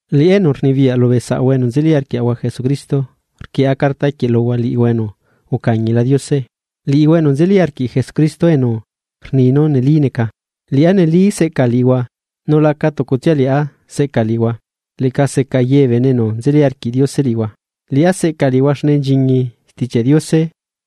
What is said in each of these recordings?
Liꞌá enu rnibiyaꞌ lubee saꞌahua enu nzeli arquiaꞌahua Jesucristo, rquieꞌa carta quieꞌ luhua liꞌihua enu ucañila Diose, liꞌihua enu nzeli arquiꞌ Jesucristo enu rni nu neli neca. Liꞌá neli seꞌca liꞌihua nu laca tucutsia liꞌá seꞌca liꞌihua, leꞌca seca ye bee bene enu nzeli arquiꞌ Diose liꞌihua. Liꞌá seꞌca liꞌihua xne nchiñi Stichiaꞌ Diose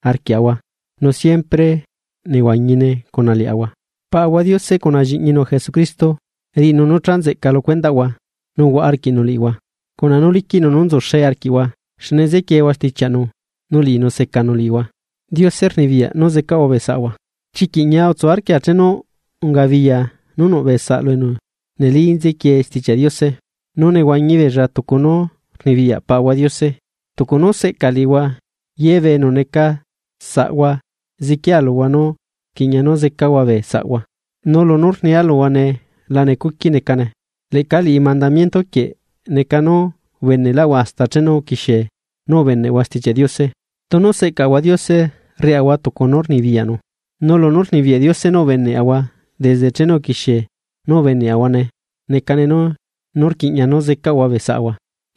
arquiaꞌahua nu siempre nehuañine cuna liaꞌahua. Paꞌahua Diose cuna Lliꞌñinu Jesucristo, riꞌinu nu cha nzeꞌca lu cuendaꞌhua nu huaꞌa arquiꞌnu liꞌihua cuna nu liquiꞌnu nú nzuxee arquiꞌhua, xne nzequieehua stichiaꞌnu, nu liꞌinu secanu liꞌihua. Diose rnibiyaꞌ nú zecaꞌahua bee saꞌahua. Chiquiꞌ ñia utsu arquia chenu ungabiya nu nuꞌ bee saꞌlu enu neli nzequie Stichiaꞌ Diose, nu nehuañi beella tucu nu rnibiyaꞌ Paꞌahua Diose. Tucu nú seꞌca liꞌihua, ye bee enu neca saꞌahua ziquia luhua nu rquiꞌña nu zecahua bee saꞌahua. Nu lunú rnia luhua nee la necuqui necane, leꞌca liꞌi mandamiento quieꞌ neca nú ubeneꞌlaꞌhua hasta chenu uquixie nú ubeneꞌhua Stichiaꞌ Diose. Tunu seꞌcaꞌahua Diose rriaꞌahua tucu nu rnibiyaꞌnu; nu lunú rnibiyaꞌ Diose nú ubeneꞌahua desde chenu uquixie nú ubeneꞌahuane necane nu rquiꞌña nú zecaꞌahua bee saꞌahua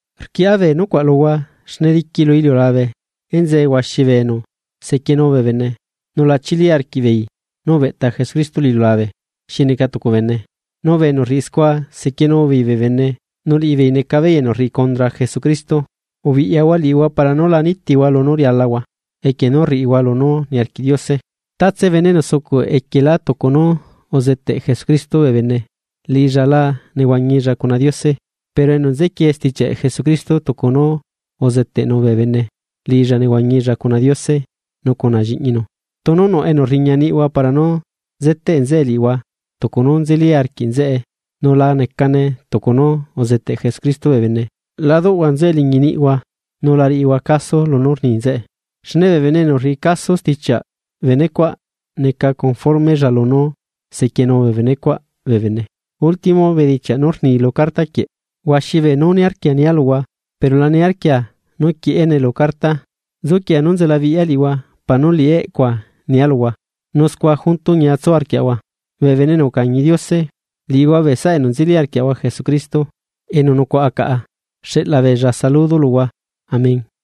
Rquieꞌa bee nucuaꞌ luhua xne diqui lu iliulabe enzee huaxi bee bene enu sequienu bee bene, nu la chili arquiꞌbeei nú ubeꞌta Jesucristo lu iliulabe xi neca tucu bene. Nu bee enu rriꞌi scua sequienu beei bee bene, nu liꞌibeei neca beei enu rriꞌi condra Jesucristo. Ubiꞌyahua liꞌihua para nu la nitihua lunú rialahua, equie nu rriꞌihua lunú niarquiꞌ Diose. Tatse bene enu sucuꞌ equielá tucu nu uzeteꞌ Jesucristo bee bene, liꞌilla la nehuañilla cuna Diose, pero enu nzequie stichiaꞌ Jesucristo tucu nu uzeteꞌnu bee bene, liꞌilla nehuañilla cuna Diose nu cuna Lliꞌñinu. Tunu nuꞌ enu rriña niꞌhua para nu zeteꞌ nzeꞌe liꞌihua tucu nu nzeli arquiꞌ nzeꞌe nu la necane tucu nu uzeteꞌ Jesucristo bee bene, la duꞌhua nzeꞌe liñi niꞌhua nu la riꞌihua caso lunú rni nzeꞌe. Xne bee bene enu rriꞌi caso stichiaꞌ bene cuaꞌ neca conformella lunú sequienu bene cuaꞌ bee bene. Último bedichiaꞌ nú rni lu carta quieꞌ. Huaxi beenú niarquia nia luhua, pero la niarquia nu quieꞌene lu carta. Nzuquia nú nzela biꞌya liꞌihua para nú liꞌi eꞌcua nia luhua, nu scua junto ñia tsu arquiaꞌahua. Bee bene enu ucañi Diose, liꞌihua bee saꞌa enu nzeli arquiaꞌahua Jesucristo enu nucuaꞌa caꞌa, xeꞌla beella saludo luhua. Amén.